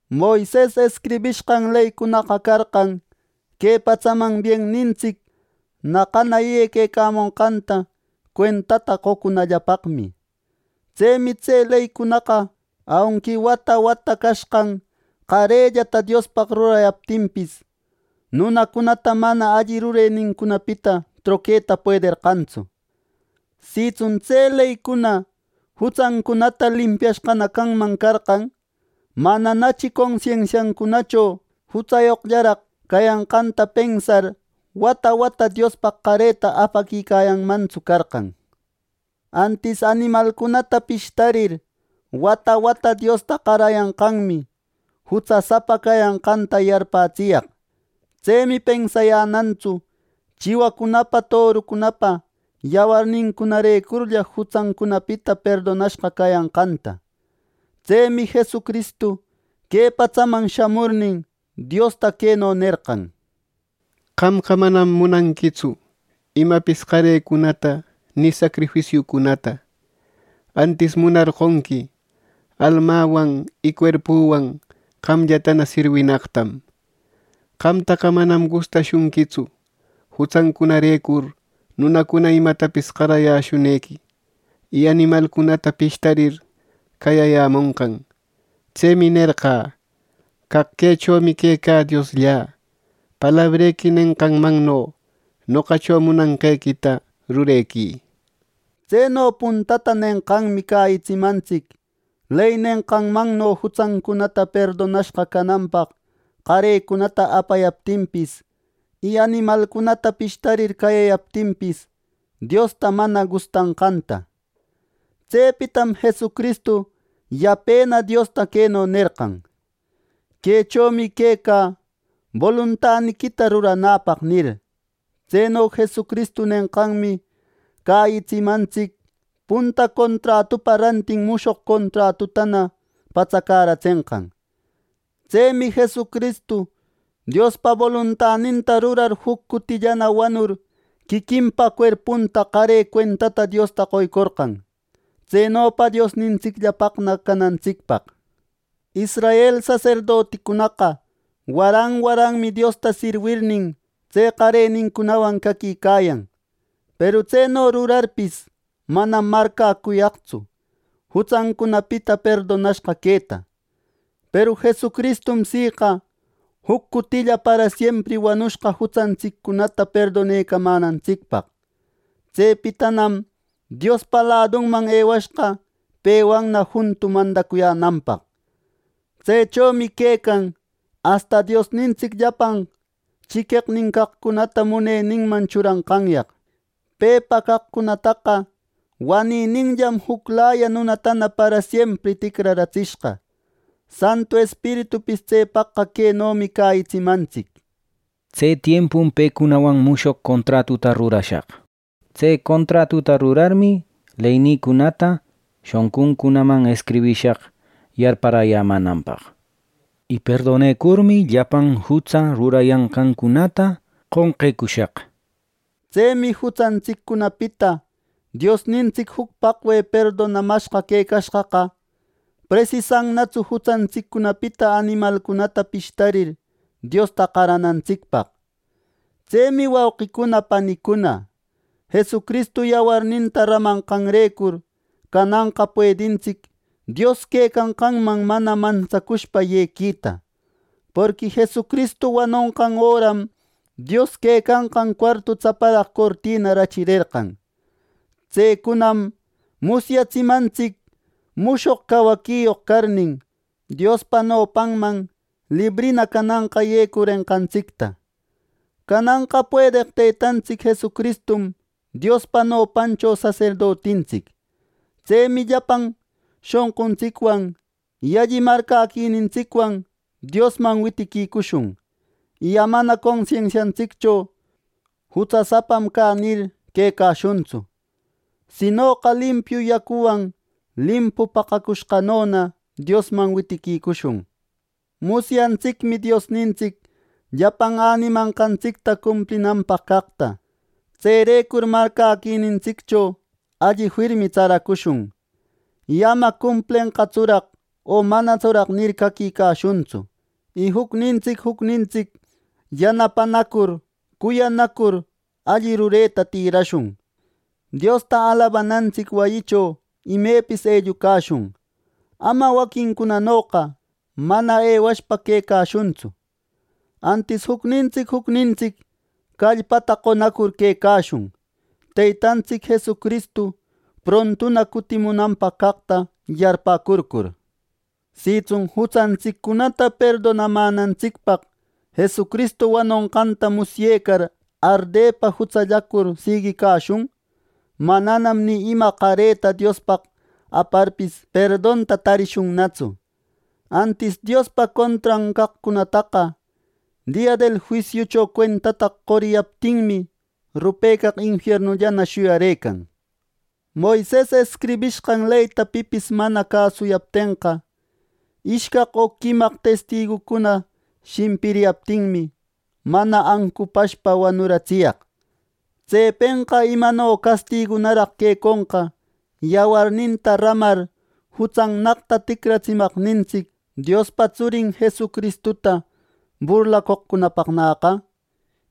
Moises escribishqan leycunaqa carqan que patsaman biennintsic naqana yequecamonqanta cuentata qocunallapaqmi. Tsemi tse leycunaqa aunqui wata wata cashqan qarellata Diospaq rurayaptinpis, nunacunata mana alli rurenincunapita troqueta puederqantsu. Sitsun tse leycuna jutsancunata limpiashqana canman carqan, mananachi consensiancunacho jutsayoqllaraq cayanqanta pensar wata wata Diospaq qareta apaquicayanmantsu carqan. Antis animalcunata pishtarir, wata wata Diosta qarayanqanmi jutsasapa cayanqanta yarpätsiyaq Tsemi pensayänantsu chiwacunapa torucunapa yawarnincunarecurlla jutsäcunapita perdonashqa cayanqanta. Tsemi Jesucristu que patsaman shamurnin, Diosta queno nerqan: “Qamqa manam munanquitsu imapis qarecunata ni sacrifisiucunata. Antis munarqonqui almäwan y cuerpüwan qamllatana sirwinaqtam. Qamtaqa manam gustashunquitsu jutsancunarecur nunacuna imatapis qarayäshunqequi, y animalcunata pishtarir cayayämonqan. Tsemi nerqä: ‘Caq quechomi quecä Diosllä. Palabrequi nenqanmanno noqacho munanqequita rurequï’” nir. Tseno puntata nenqanmi cäyitsimantsic ley nenqanmanno jutsancuna perdonashqa cananpaq qarecunata apayaptinpis, y animalcunata pishtarir cayayaptinpis, Diosta mana gustanqanta. Tsepitam Jesucristu yapena Diosta queno nerqan: “Quechomi quecä boluntaniquita ruranäpaq” nir. Tseno Jesucristu nenqanmi cäyitsimantsic punta contratupa rantin, mushoq contratutana patsäratsenqanta. Tsemi Jesucristu Diospa boluntaninta rurar juc cutillana wanur quiquinpa cuerpunta qare cuentata Diosta qoycorqan, tsenopa Diosnintsicllapaqna canantsicpaq. Israel saserdoticunaqa waran waranmi Diosta sirwirnin, tse qarenincunawan caquicayan; peru tseno rurarpis, manam marcäcuyaqtsu jutsancunapita perdonashqa queta. Peru Jesucristum siqa juc cutilla parasiempri wanushqa jutsantsiccunata perdonecamänantsicpaq. Tsepitanam Diospa ladunman ewashqa pewanna juntu mandacuyänanpaq. Tsechomi quecan, asta Diosnintsic llapan chiqueqnincaqcunata muneninman churanqanyaq. Pepa caqcunataqa wanininllam juclaya nunatana parasiempri ticraratsishqa. Santu Espiritupis tsepaqqa quenomi cäyitsimantsic: “Tse tiempum pecunawan mushog contratuta rurashaq” ninmi Dios. “Tse contratuta rurarmi leynïcunata shonquncunaman escribishaq yarparäyämänanpaq. Y perdonecurmi llapan jutsa rurayanqancunata qonqecushaq” nir. Tsemi jutsantsiccunapita Diosnintsic juc paqwe perdonamashqa quecashqaqa, presisannatsu jutsantsiccunapita animalcunata pishtarir, Diosta qaranantsicpaq. Tsemi wauqicuna panicuna, Jesucristu yawarninta ramanqanrecur cananqa puedintsic Dios quecanqanman mana mantsacushpa yequita. Porqui Jesucristu wanonqan öram Dios quecanqan cuartu tsaparaq cortina rachirerqan. Tsecunam musyatsimantsic mushoq cawaquiyoq carnin, Diospa nopanman librina cananqa yecurenqantsicta. Cananqa puedeq Teytantsic Jesucristum Diospa nopancho saserdotintsic. Tsemi llapan shonquntsicwan, y alli marcäquinintsicwan Diosman witiquicushun; y amana consensiantsiccho “Jutsasapam cä” nir, quecashuntsu; sinoqa limpiu yacuwan limpu paqacushqanona Diosman witiquicushun. Musyantsicmi Diosnintsic llapan änimanqantsicta cumplinanpaq caqta. Tserecur marcäquinintsiccho alli firmi tsaracushun, y ama “¿Cumplenqatsuraq o manatsuraq?” nir, caquicashuntsu. Y jucnintsic jucnintsic yanapanacur cuyanacur alli rureta tïrashun. Diosta alabanantsic wayicho imepis ellucashun ama waquincunanoqa mana ewashpa quecashuntsu. Antis jucnintsic jucnintsic callpata qonacur quecashun, Teytantsic Jesucristu prontuna cutimunanpaq caqta yarpäcurcur. Sitsun jutsantsiccunata perdonamänantsicpaq Jesucristu wanonqanta musyecar ardepa jutsallacur siguiquicashun; mananam ni ima qareta Diospaq aparpis, perdonta tarishunnatsu. Antis Diospa contran caqcunataqa dia del juisiucho cuentata qoriyaptinmi rupecaq infiernullana shuyarëcan. Moises escribishqan leyta pipis mana cäsucuyaptenqa, ishcaq o quimaq testigucuna shimpiriyaptinmi, mana ancupashpa wanuratsiyaq. Tsepenqa ¡imano castigunaraq queconqa yawarninta ramar jutsannaqta ticratsimanqantsic Diospa Tsurin Jesucristuta burlacoqcunapaqnäqa,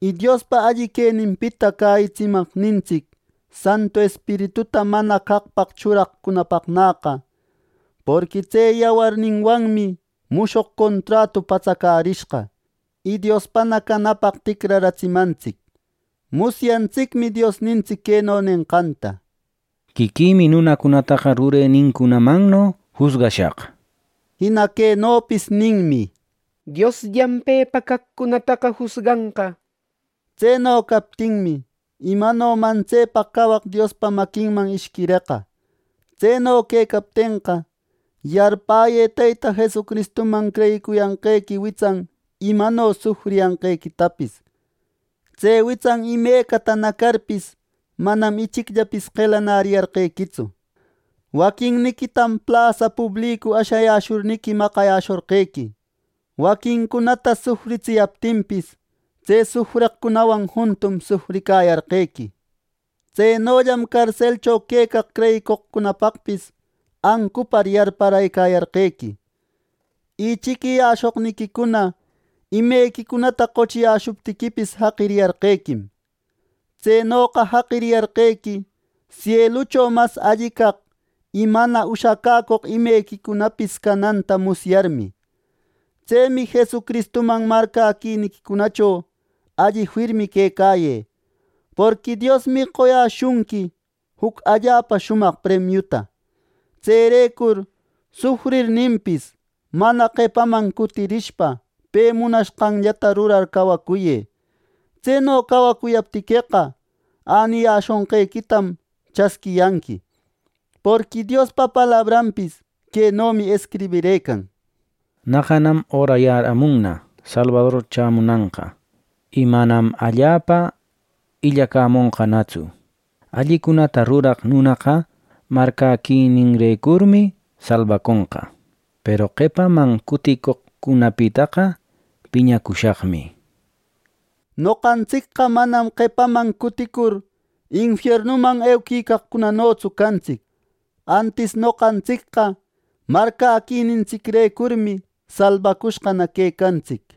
y Diospa alli queninpita cäyitsimaqnintsic Santu Espirituta mana caqpaq churaqcunapaqnäqa! Porqui tse yawarninwanmi mushoq contratu patsacärishqa, y Diospana canapaq ticraratsimantsic. Musyantsicmi Diosnintsic queno nenqanta: “Quiquïmi nunacunataqa rurenincunamanno jusgashaq” nir. Jina quenopis ninmi: “Diosllam pepa caqcunataqa jusganqa” nir. Tseno captinmi, ¡imano mantsepaq cawaq Diospa maquinman ishquireqa! Tseno quecaptenqa, yarpäyë Teyta Jesucristuman creyicuriyanqequi witsan imano sufriyanqequitapis. Tse witsan imecata ñacarpis, manam ichicllapis qelanäriyarqequitsu. Waquinniquitam plasa publicu ashayäshurniqui maqayäshorqequi. Waquincunata sufritsiyaptinpis, tse sufreqcunawan juntum sufricayarqequi. Tsenollam carselcho quecaq creyicoqcunapaqpis ancupar yarparëcayarqequi. Y chiquiyäshoqniquicuna imequicunata qochiyäshuptiquipis, jaqiriyarqequim. Tsenoqa jaqiriyarqequi sielucho mas alli caq, y mana ushacäcoq imequequicunapis cananta musyarmi. Tsemi Jesucristuman marcäquiniquicunacho alli firmi quecayë; porqui Diosmi qoyäshunqui juc allapa shumaq premiuta. Tserecur sufrirninpis, mana qepaman cutirishpa pe munashqanllata rurar cawacuyë. Tseno cawacuyaptiqueqa, äniyäshonqequitam chasquiyanqui. Porqui Diospa palabranpis quenomi escribirëcan: “Naqanan örayäramunna Salbador chämunanqa, y manam allapa illacämonqanatsu. Allicunata ruraq nunäqa marcäquininrecurmi salbaconqa, peru qepaman cuticoqcunapitaqa piñacushaqmi” nir. Noqantsicqa manam qepaman cuticur infiernuman euquicaqcunanotsu cantsic. Antis noqantsicqa marcäquinintsicrecurmi salbacushqana quecantsic.